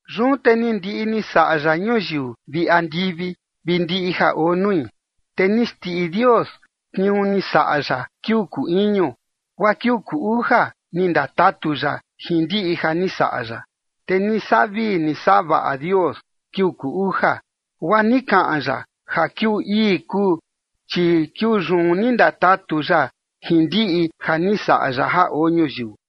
Yun te ni ndiꞌi ni saꞌa ya ñuyiu vi andivi vi ndiꞌi ja oo nui. Te ni xndiꞌi Dios tniuu ni saꞌa ya kiuu kuu iñu, guaa kiuu kuu uja ni ndatatu ya jin ndiꞌi ja ni saꞌa ya. Te ni saꞌa vii ni saꞌa vaꞌa Dios kiuu kuu uja, guaa ni kaꞌan ya ja kiuu ii kuu, chi kiuu yun ni ndatatu ya jin ndiꞌi ja ni saꞌa ya ja oo ñuyiu.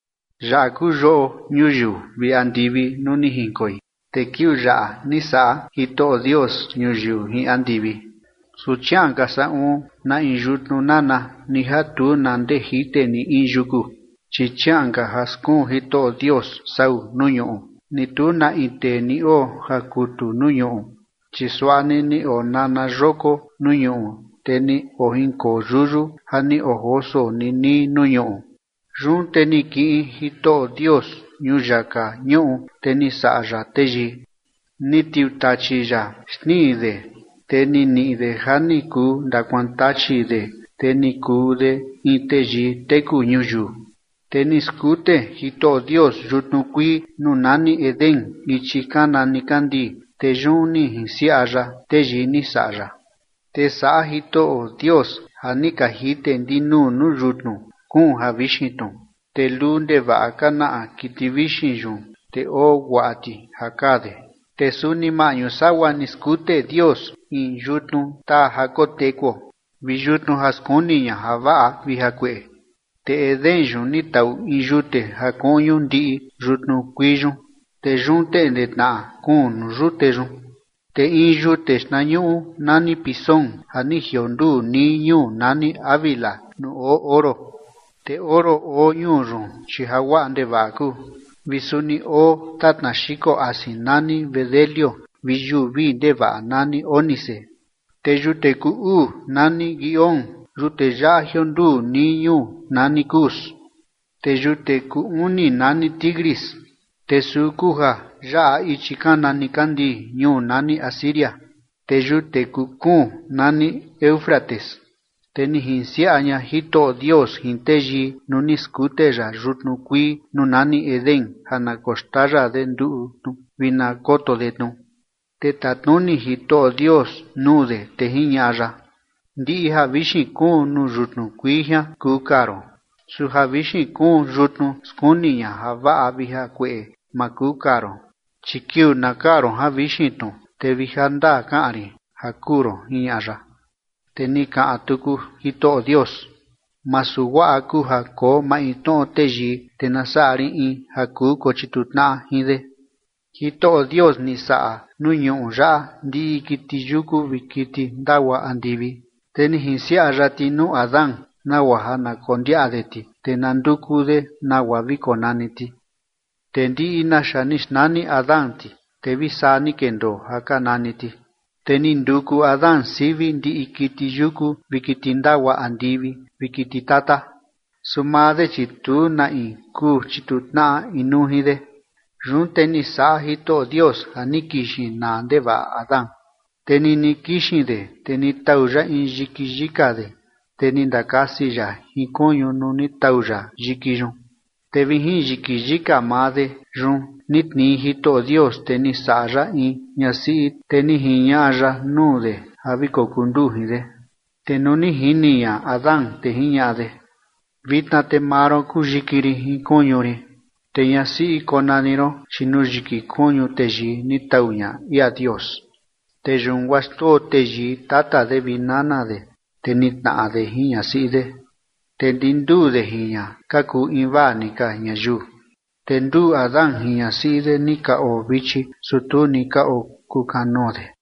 Yaꞌa kuu yoꞌo ñuyiu vi andivi nuu ni jinkoi, te kiuu yaꞌa ni saꞌa Jitoꞌo Dios ñuyiu jin andivi. Su chiaꞌan ka saꞌun na in yutnu nana ni ja tu na ndee jite ni in yuku, chi chiaꞌan ka ja skuun Jitoꞌo Dios sau nuu ñuꞌu, ni tu na in tee ni oo ja kutu nuu ñuꞌu. Chi suaꞌa ni ni onana yoko nuu ñuꞌu, te ni ojinkoo yuyu ja ni ojoso nii nii nuu ñuꞌu. Yun te ni kiꞌin Jitoꞌo Dios ñuyaka ñuꞌu, te ni saꞌa ya teyii. Ni tiutachi ya xtnii de, te ni niꞌi de ja ni kuu ndakuaan tachi de, te ni kuu de in teyii teku ñuyiu. Te ni skute Jitoꞌo Dios yutnu kuii nuu nani Edén ichi kana nikandii, te yun ni jinsiaꞌa ya teyii ni saꞌa ya. Te saꞌa Jitoꞌo Dios ja ni ka jite ndinuu nuu yutnu kuun javixin tnu, te luu ndevaꞌa ka naꞌa kiti vixin yun, te oo guaꞌa ti ja kaa de. Te suni maꞌñu sagua ni skute Dios in yutnu taa ja kotekuo vi yutnu ja skuni ña javaꞌa vi jakueꞌe. Te Edén yun ni taꞌu in yute ja kuꞌñu ndiꞌi yutnu kuii yun, te yun teꞌnde tnaꞌa kuun nuu yute yun. Te in yute xtnañuꞌu nani Pisón ja ni jionduu nii ñuu nani Havila nuu oo oro. Te oro oo ñuu yun, chi ja guaꞌa ndevaꞌa kuu vi suni oo tatna xiko asin nani bedelio vi yuu vii ndevaꞌa nani ónice. Te yute kuu uu nani Gihón. Yute yaꞌa jionduu nii ñuu nani Cus. Te yute kuu uni nani Tigris. Te suu kuu ja yaꞌa ichi kana nikandii ñuu nani Asiria. Te yute kuu kuun nani Éufrates. Te ni jinsiaꞌa ña Jitoꞌo Dios jin teyii nuu ni skute ya yutnu kuii nuu nani Edén ja na koxtaya de nduꞌu tnu vi na koto de tnu. Te tatnuni Jitoꞌo Dios nuu de, te jiñaꞌa ya: ―Ndiꞌi javixin kuun nuu yutnu kuii jian kuu kaa ron. Su javixin kuun yutnu skuni ña javaꞌa vi jakueꞌe ma kuu kaa ron, chi kiuu na kaa ron javixin tnu, te vi jandaa kaꞌan rin ja kuu ron ―jiñaꞌa ya. Te ni kaꞌan tuku Jitoꞌo Dios: ―Masu guaꞌa kuu ja koo maintnoꞌo teyii, te na saꞌa rin in ja kuu kochituu tnaꞌa jin de. Jitoꞌo Dios ni saꞌa nuu ñuꞌu yaꞌa ndiꞌi kiti yuku vi kiti ndagua andivi, te ni jinsiaꞌa ya ti nuu Adán nagua ja na kondiaꞌa de ti, te na nduku de nagua vi konani ti. Te ndiꞌi naxa ni xnani Adán ti, te vi saa ni kendoo ja ka nani ti. Te ni nduku Adán sivi ndiꞌi kiti yuku vi kiti ndagua andivi vi kiti tata. Su maa de, chi tu na in kuu chituu tnaꞌa inuu jin de. Yun te ni saꞌa Jitoꞌo Dios ja ni kixin naa ndevaꞌa Adán, te nini kixin de, te ni tau ya in yiki yika de, te ni ndakasi ya jin kuñu nuu ni tau ya yiki yun. Te vi jin yiki yika maa de yun ni tnii Jitoꞌo Dios, te ni saꞌa ya in ñasiꞌi, te ni jiñaꞌa ya nuu de ja vi kokuu nduu jin de. Te nuu ni jini ña Adán, te jiñaꞌa de: ―Vitna te maa ron kuu yiki rin jin kuñu rin, te ñasiꞌi konani ron, chi nuu yiki kuñu teyii ni tau ña ia Dios. Te yun guaa xndoo teyii tata de vi nana de, te nitnaꞌa de jin ñasiꞌi de, te ndi nduu de jin ña ka kuu invaa ni ka ñayiu. Te nduu Adán jin ñasiꞌi de ni ka oo vichi, su tu ni ka okuu kanoo de.